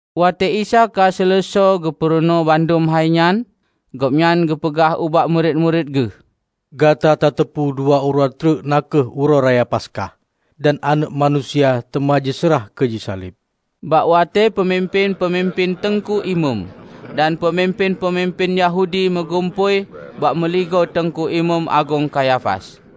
Watée Isa ka seuleusoe geupurunoe bandum hai nyan, Gobnyan geupeugah ubak murit-murit Geuh, "Gata tateupeue dua uroe treuk na kheueh Uroe Raya Paskah, dan Aneuëk Manusia teuma jiseurah keu jisaleb!" Bak watée peumimpén-peumimpén teungku imeum dan peumimpén-peumimpén Yahudi meugumpôi bak meuligoe Teungku Imeum Agong Kayafas.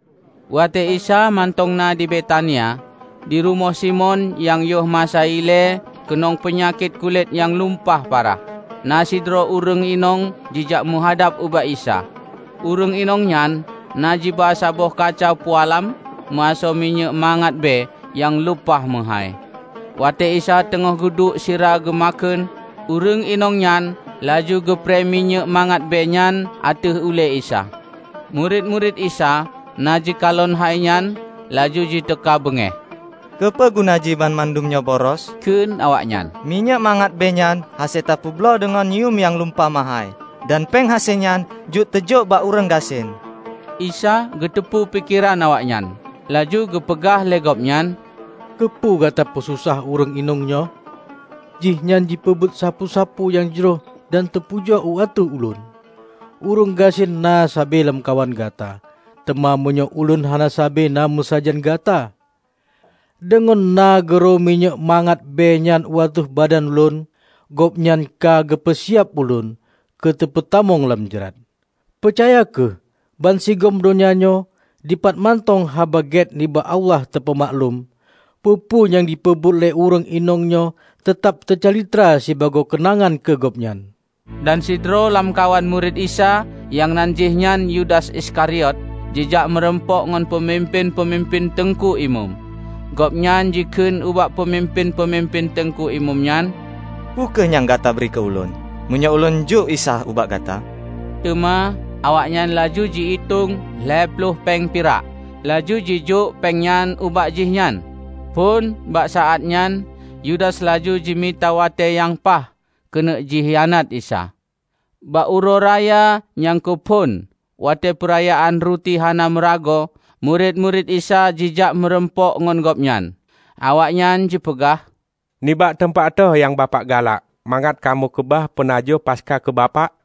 Watée Isa mantong na di Betania, di rumoh Simon nyang yoh masa ilée keunong peunyakét kulét nyang lumpah parah, na sidroe ureuëng inong jijak meuhadab ubak Isa. Ureuëng inong nyan na jiba saboh kaca pualam, meuasoe minyéuk mangat bée nyang lumpah meuhái. Watée Isa teungoh geuduek sira geumakheun, ureuëng inong nyan laju geuprée minyéuk mangat bée nyan ateueh ulée Isa. Murit-murit Isa na jikalon hai nyan laju jiteuka beungéh. "Keupeue guna jih banmandum nyoe boros?" kheun awaknyan. "Minyéuk mangat bée nyan hase teupeubloe deungon yuem nyang lumpah meuhái, dan péng hase nyan jeuet teujok bak ureuëng gasien!" Isa geuteupeue pikeran awaknyan, laju geupeugah lé Gobnyan, "Keupeue gata peususah ureuëng inong nyoe? Jih nyan jipeubuet sapeue-sapeue nyang jroh dan teupujoe u ateueh Ulôn. Ureuëng gasien na sabe lamkawan gata, teuma meunyoe Ulôn hana sabe na meusajan gata. Deungon na geuro minyéuk mangat bée nyan u ateueh badan Lôn, gobnyan ka geupeu siab Ulôn keu teupeutamong lam jrat. Peucaya kheueh! Bansigom donya nyoe, dipat mantong Haba Gét nibak Allah teupeumaklum, peue-peue nyang jipeubuet lé ureuëng inong nyoe teutab teucalitra sibagoe keunangan keu gobnyan." Dan sidroe lamkawan murit Isa nyang nan jihnyan Yudas Iskariot, jijak meurumpok ngon peumimpén-peumimpén teungku imeum. Gobnyan jikheun ubak peumimpén-peumimpén teungku imeum nyan, "Peu kheueh nyang gata bri keu ulôn meunyoe ulôn jok Isa ubak gata?" Teuma awaknyan laju ji-itong lhée ploh péng pirak, laju jijok péng nyan ubak jihnyan. Phon bak saát nyan Yudas laju jimita watée nyang paih keuneuk jikhianat Isa. Bak uroe raya nyang keuphon watée Peurayaan Ruti Hana Meuragoe, murit-murit Isa jijak meurumpok ngon Gobnyan. Awaknyan jipeugah, "Nibak teumpat toh nyang Bapak galak mangat kamoe keubah peunajoh Paskah keu Bapak?"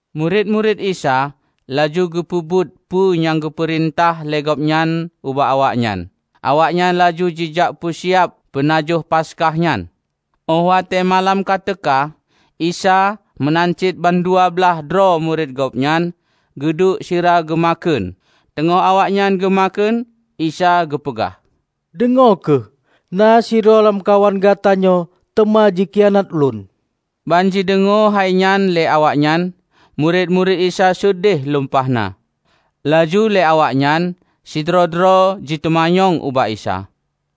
Murit-murit Isa laju geupeubuet peue nyang geupeurintah lé Gobnyan ubak awaknyan. Awaknyan laju jijak peusiab peunajoh Paskah nyan. Óh watée malam ka teuka, Isa meunan cit bandua blaih droe murit Gobnyan geuduek sira geumakheun, teungoh awaknyan geumakheun, Isa geupeugah, "Deungoe kheueh: na sidroe lamkawan gata nyoe teuma jikhianat Ulôn." Ban jideungoe hai nyan lé awaknyan, murit-murit Isa seudeh lumpah na. Laju lé awaknyan, sidroe-droe jiteumanyong ubak Isa,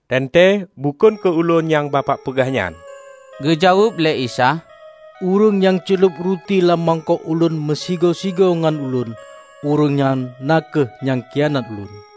"Teuntée bukon keu ulôn nyang Bapak peugah nyan?" Geujaweueb lé Isa, "Ureuëng nyang ceulob ruti lam mangkok Ulôn meusigoe-sigoe ngon Ulôn, ureuëng nyan kheueh nyang khianat Ulôn.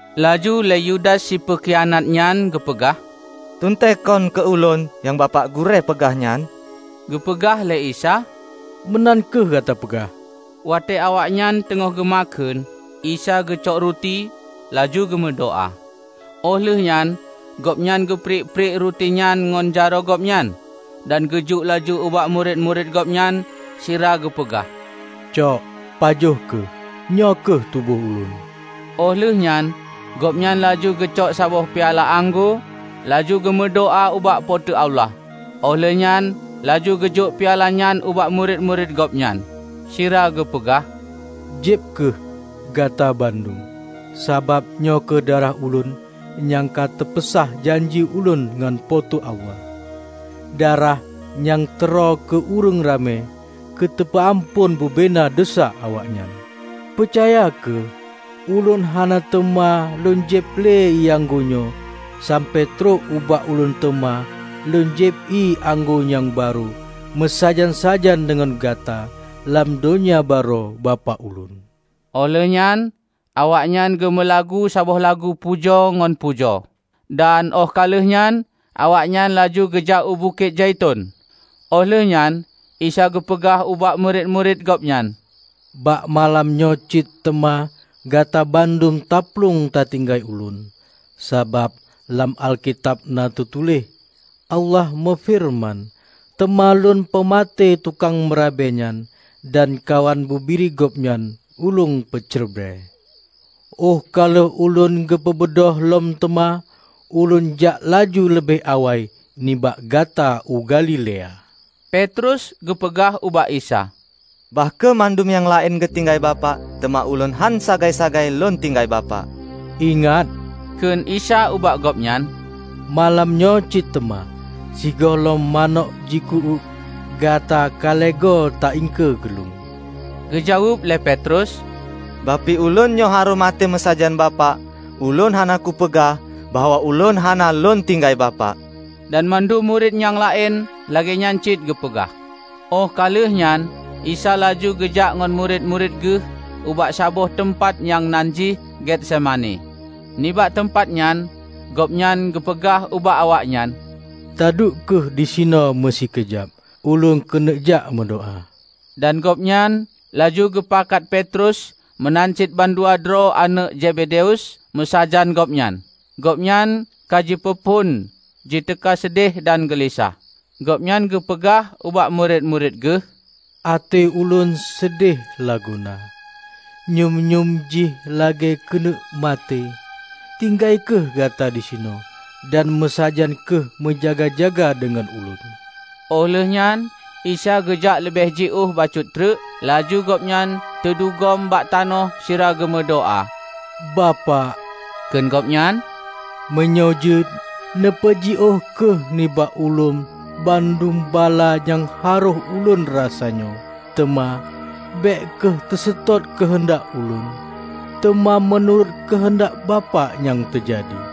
Laju lé Yudas si peukhianat nyan geupeugah, "Teuntée kon keu ulôn nyang Bapak Gurée peugah nyan?" Geupeugah lé Isa, "Meunan kheueh gata peugah!" Watée awaknyan teungoh geumakheun, Isa geucok ruti, laju geumeudoá. Óh lheueh nyan Gobnyan geupriek-priek ruti nyan ngon jaroe Gobnyan dan geujok laju ubak murit-murit Gobnyan sira geupeugah, "Cok, pajoh kheueh; nyoe kheueh tuboh Ulôn." Óh lheueh nyan Gobnyan laju geucok saboh piala anggô, laju geumeudoá ubak Po teu Allah. Óh lheueh nyan laju geujok piala nyan ubak murit-murit Gobnyan, sira geupeugah, "Jieb kheueh, gata bandum. Sabab nyoe kheueh darah Ulôn nyang ka teupeusah janji Ulôn ngon Po teu Allah -- darah nyang teuroe keu ureuëng ramé keu teupeu amphon bubena desya awaknyan. Peucaya kheueh: Ulôn hana teuma Lôn jieb lé ié anggô nyoe sampoe trok ubak Ulôn teuma Lôn jieb ié anggô nyang barô meusajan-sajan deungon gata lam Donya Barô Bapak Ulôn." Óh lheueh nyan awaknyan geumeulagu saboh lagu puja ngon pujoe. Dan óh ka lheueh nyan awaknyan laju geujak u Bukét Zaiton. Óh lheueh nyan Isa geupeugah ubak murit-murit Gobnyan, "Bak malam nyoe cit teuma gata bandum taplueng tatinggai Ulôn; sabab lam Alkitab na teutuléh; Allah meufeureuman, 'Teuma Lôn peumaté tukang meurabe nyan, dan kawan bubiri gobnyan Ulôn peucrebre.' Óh ka lheueh Ulôn geupeubeudôh lom teuma, Ulôn jak laju leubeh awai nibak gata u Galilea." Petrus geupeugah ubak Isa, "Bah kheueh mandum nyang laén geutinggai Bapak, teuma ulôn hán sagai-sagai lôn tinggai Bapak!" "Ingat," Kheun Isa ubak gobnyan, "Malam nyoe cit teuma, sigohlom manök jiku-uék, gata ka lhée goe ta-iengkeue keu ulôn." Geujaweueb lé Petrus, "Bah pih ulôn nyoe harôh maté meusajan Bapak, ulôn hana kupeugah bahwa ulôn hana lôn tinggai Bapak!" Dan mandum murit nyang laén lagée nyan cit geupeugah. Óh ka lheueh nyan Isa laju geujak ngon murit-murit Geuh ubak saboh teumpat nyang nan jih Getsemani, nibak teumpat nyan Gobnyan geupeugah ubak awaknyan, "Taduek kheueh disinoe meusikeujab Ulôn keuneuk jak meudoá." Dan Gobnyan laju geupakat Petrus meunan cit bandua droe aneuëk Zebedius meusajan Gobnyan. Gobnyan ka jipeuphon jiteuka seudeh dan geulisah. Gobnyan geupeugah ubak murit-murit Geuh, "Até Ulôn seudeh lagoena, nyum-nyum jih lagée keuneuk maté. Tinggai kheueh gata disinoe, dan meusajan kheueh meujaga-jaga deungon Ulôn." Óh lheueh nyan Isa geujak leubeh jiôh bacut treuk, laju Gobnyan teudugom bak tanoh sira geumeudoá. "Bapak," kheun Gobnyan, "Meunyoe jeuet, neupeujiôh kheueh nibak Ulôn bandum bala nyang harôh Ulôn rasa nyoe. Teuma bék kheueh teuseutôt keuheundak Ulôn, teuma meunurot keuheundak Bapak nyang teujadi."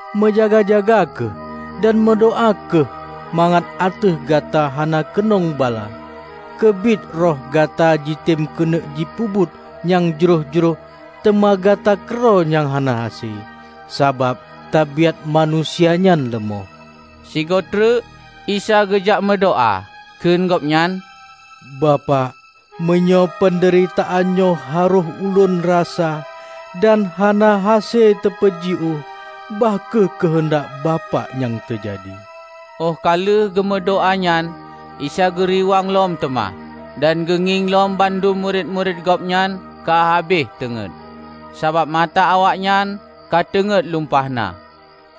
Meujaga-jaga kheueh, dan meudoá kheueh mangat ateueh gata hana keunong bala. Keubiet roh gata jitem keuneuk jipeubuet nyang jroh-jroh teuma gata keudroe nyang hana hase, sabab tabaiát manusia nyan leumoh." Sigoe treuk Isa geujak meudoá, kheun Gobnyan, "Bapak, meunyoe peundeuritaan nyoe harôh Ulôn rasa, dan hana hase teupeujiôh, bah kheueh keuheundak Bapak nyang teujadi." Óh ka lheueh geumeudoá nyan Isa geuriwang lom teuma, dan geungieng lom bandum murit-murit Gobnyan ka habéh teungét, sabab mata awaknyan ka teungét lumpah na.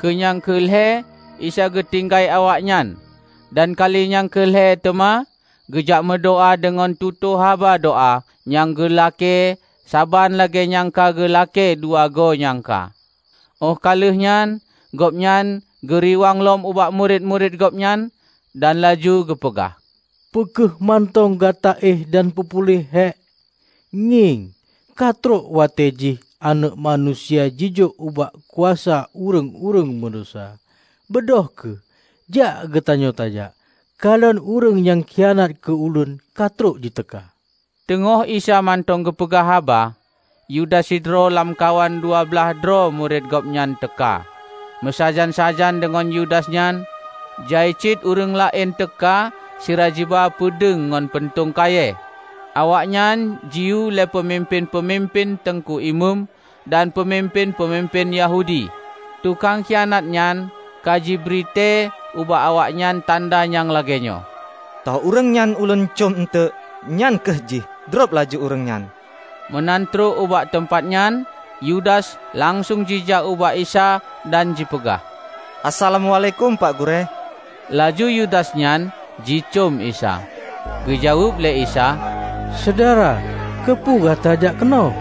Keu nyang keu lhée Isa geutinggai awaknyan dan kali nyang keu lhée teuma geujak meudoá deungon tutoe haba doá nyang geulakée saban lagée nyang ka geulakée dua goe nyang ka. Óh ka lheueh nyan Gobnyan geuriwang lom ubak murit-murit Gobnyan dan laju geupeugah, "Peu kheueh mantong gata éh dan peupuléh hék? Ngieng, ka trok watée jih Aneuëk Manusia jijok ubak kuasa ureuëng-ureuëng meudesya. Beudôh kheueh, jak geutanyoe tajak. Kalon Ureuëng nyang khianat keu Ulôn ka trok jiteuka!" Teungoh Isa mantong geupeugah haba, Yudas sidroe lamkawan dua blaih droe murit Gobnyan teuka. Meusajan-sajan deungon Yudas nyan, jai cit ureuëng laén teuka sira jiba peudeueng ngon puntông kayée. Awaknyan jiyue lé peumimpén-peumimpén teungku imeum dan peumimpén-peumimpén Yahudi. Tukang khianat nyan ka jibri tée ubak awaknyan tanda nyang lagée nyoe, "Toh ureuëng nyang ulôn cöm eunteuk, nyan kheueh jih. Drob laju ureuëng nyan!" Meunan trok ubak teumpat nyan, Yudas langsong jijak ubak Isa dan jipeugah, "Assalamuálaikum, Pak Gurée!" Laju Yudas nyan jicöm Isa. Geujaweueb lé Isa, "Syedara, keupeue gata jak keunoe?"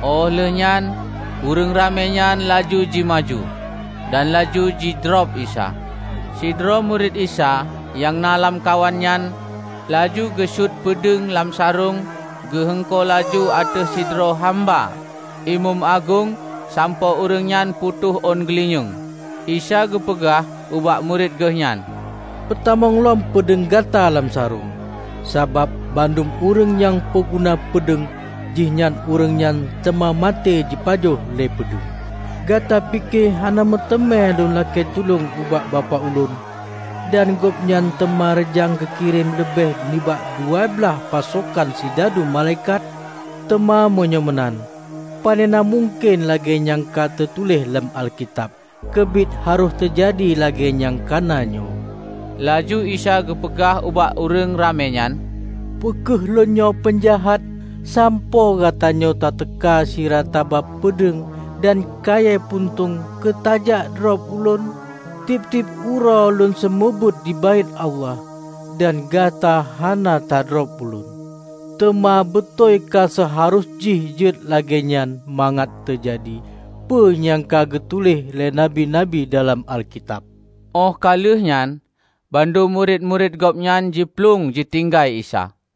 Óh lheueh nyan ureuëng ramé nyan laju ji maju, dan laju jidrob Isa. Sidroe murit Isa nyang na lamkawan nyan laju geusuet peudeueng lam sarong geu-heungko laju ateueh sidroe hamba imeum agong sampoe ureuëng nyan putôh ôn geulinyueng. Isa geupeugah ubak murit Geuh nyan, "Peutamong lom peudeueng gata lam sarong, sabab bandum ureuëng nyang peuguna peudeueng jih ureuëng nyan teuma maté jipajoh lé peudeueng. Gata pike hana meuteumé Lôn lakée tulông ubak Bapak Ulôn, dan Gobnyan teuma reujang geukirém leubeh nibak dua blaih pasokan sidadu malaikat? Teuma meunyoe meunan, panena mungken lagée nyang ka teutuléh lam Alkitab keubiet harôh teujadi lagée nyang kana nyoe?" Laju Isa geupeugah ubak ureuëng ramé nyan, "Peu kheueh Lôn nyoe peunjahat, sampoe gatanyoe tateuka sira taba peudeueng dan kayée puntông keu tajak drob Ulôn? Tieb-tieb uroe Ulôn seumeubeuet di Baét Allah, dan gata hana tadrob Ulôn! Teuma beutôi ka seuharôh jih jeuet lagée nyan mangat teujadi peue nyang ka geutuléh lé nabi-nabi dalam Alkitab." Óh ka lheueh nyan, bandum murit-murit Gobnyan jiplueng jitinggai Isa.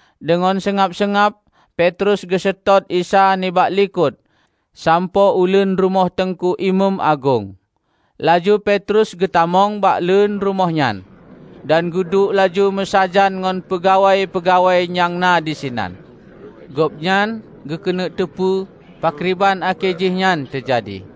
Deungon seungab-seungab Petrus geuseutôt Isa nibak likot sampoe uleuen rumoh teungku imeum agong. Laju Petrus geutamong bak leuen rumoh nyan, dan geuduek laju meusajan ngon peungawai-peungawai nyang na disinan. Gobnyan geukeuneuk teupeu pakriban akhé jih nyan teujadi.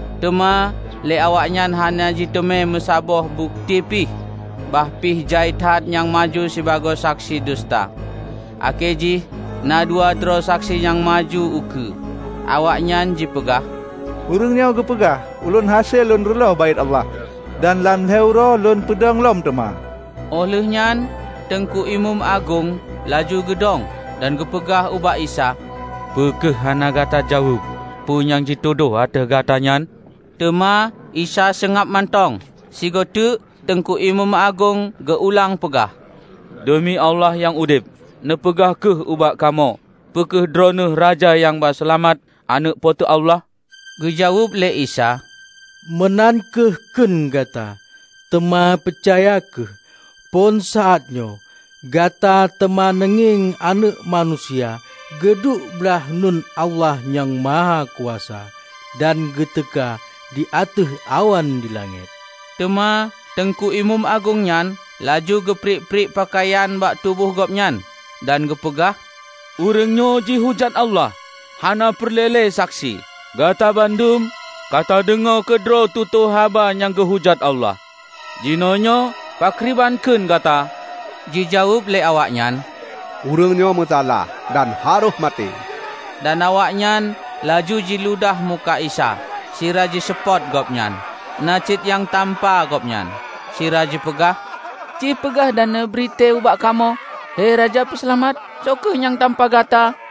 Teuma lé awaknyan hana jiteumé meusaboh bukeuti pih, bah pih jai that nyang maju sibagoe saksi duseuta. Akhé jih na dua droe saksi nyang maju ukeue. Awaknyan jipeugah, "Ureuëng nyoe geupeugah, 'Ulôn hase Lôn reuloh Baét Allah, dan lam lhée uroe hase Lôn peudong lom teuma.' " Óh lheueh nyan teungku imeum agong laju geudong, dan geupeugah ubak Isa, "Peu kheueh hana gata jaweueb peue nyang jitudôh ateueh gata nyan?" Teuma Isa seungab mantong. Sigoe teuk teungku imeum agong geu-ulang peugah, "Deumi Allah nyang udeb, neupeugah kheueh ubak kamoe peu kheueh Droeneueh Raja nyang ba Seulamat, Aneuëk Po teu Allah?" Geujaweueb lé Isa, "Meunan kheueh kheun gata. Teuma peucaya kheueh: phon saát nyoe, gata teuma neungieng Aneuëk Manusia geuduek blaih uneuen Allah Nyang Mahakuasa, dan geuteuka di ateueh awan dilangét!" Teuma teungku imeum agong nyan laju geupriek-priek peukayan bak tuboh gobnyan, dan geupeugah, "Ureuëng nyoe jihujat Allah! Hana peureulée lé saksi. Gata bandum ka tadeungoe keudroe tutoe haba nyang geuhujat Allah. Jinoenyoe pakriban kheun gata?" Jijaweueb lé awaknyan, "Ureuëng nyoe meusalah, dan harôh maté." Dan awaknyan laju jiludah muka Isa, sira jiseupôt Gobnyan. Na cit nyang tampa Gobnyan, sira jipeugah, "Ci peugah dan neubri tée ubak kamoe, he Raja Peuseulamat! Soe kheueh nyang tampa gata?"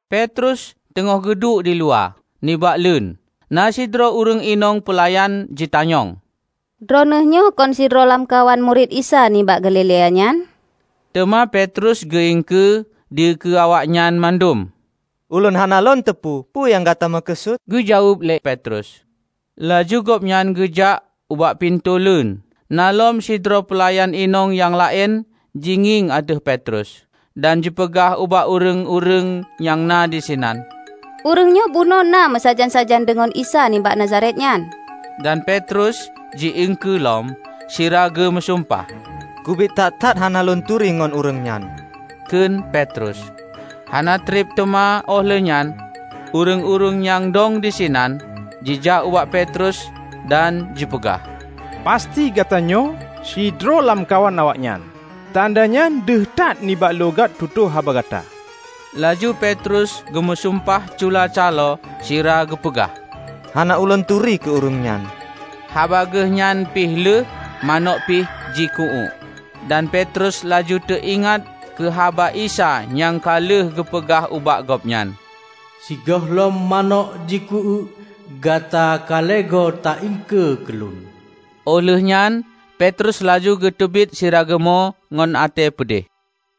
Petrus teungoh geuduek diluwa, nibak leuen. Na sidroe ureuëng inong peulayan jitanyong, "Droeneueh nyoe kon sidroe lamkawan murit Isa nibak Galilea nyan?" Teuma Petrus geu-iengkeue dikeue awaknyan mandum. "Ulôn hana lôn teupeu peue nyang gata meukeusut," geujaweueb lé Petrus laju gobnyan geujak ubak pintoe leuen. Na lom sidroe peulayan inong nyang laén jingieng ateueh Petrus, dan jipeugah ubak ureuëng-ureuëng nyang na disinan, "Ureuëng nyoe bunoe na meusajan-sajan deungon Isa nibak Nazaret nyan." Dan Petrus ji-iengkeue lom, sira geu meusumpah. "Keubiet that-that hana lôn turi ngon ureuëng nyan!" kheun Petrus. Hana treb teuma óh lheueh nyan, ureuëng-ureuëng nyang dong disinan jijak ubak Petrus, dan jipeugah, "Pasti gata nyoe sidroe lamkawan awaknyan. Tanda nyan deuh that nibak loghat tutoe haba gata." Laju Petrus geumeusumpah cula caloe sira geupeugah, "Hana ulôn turi keu ureuëng nyan!" Haba geuh nyan pih lheueh, manök pih jiku-uék. Dan Petrus laju teu-ingat keu haba Isa nyang ka lheueh geupeugah ubak gobnyan, "Sigohlom manök jiku-uék, gata ka lhée goe ta-iengkeue keu Ulôn." Óh lheueh nyan Petrus laju geuteubiet sira geumo ngon até peudeh.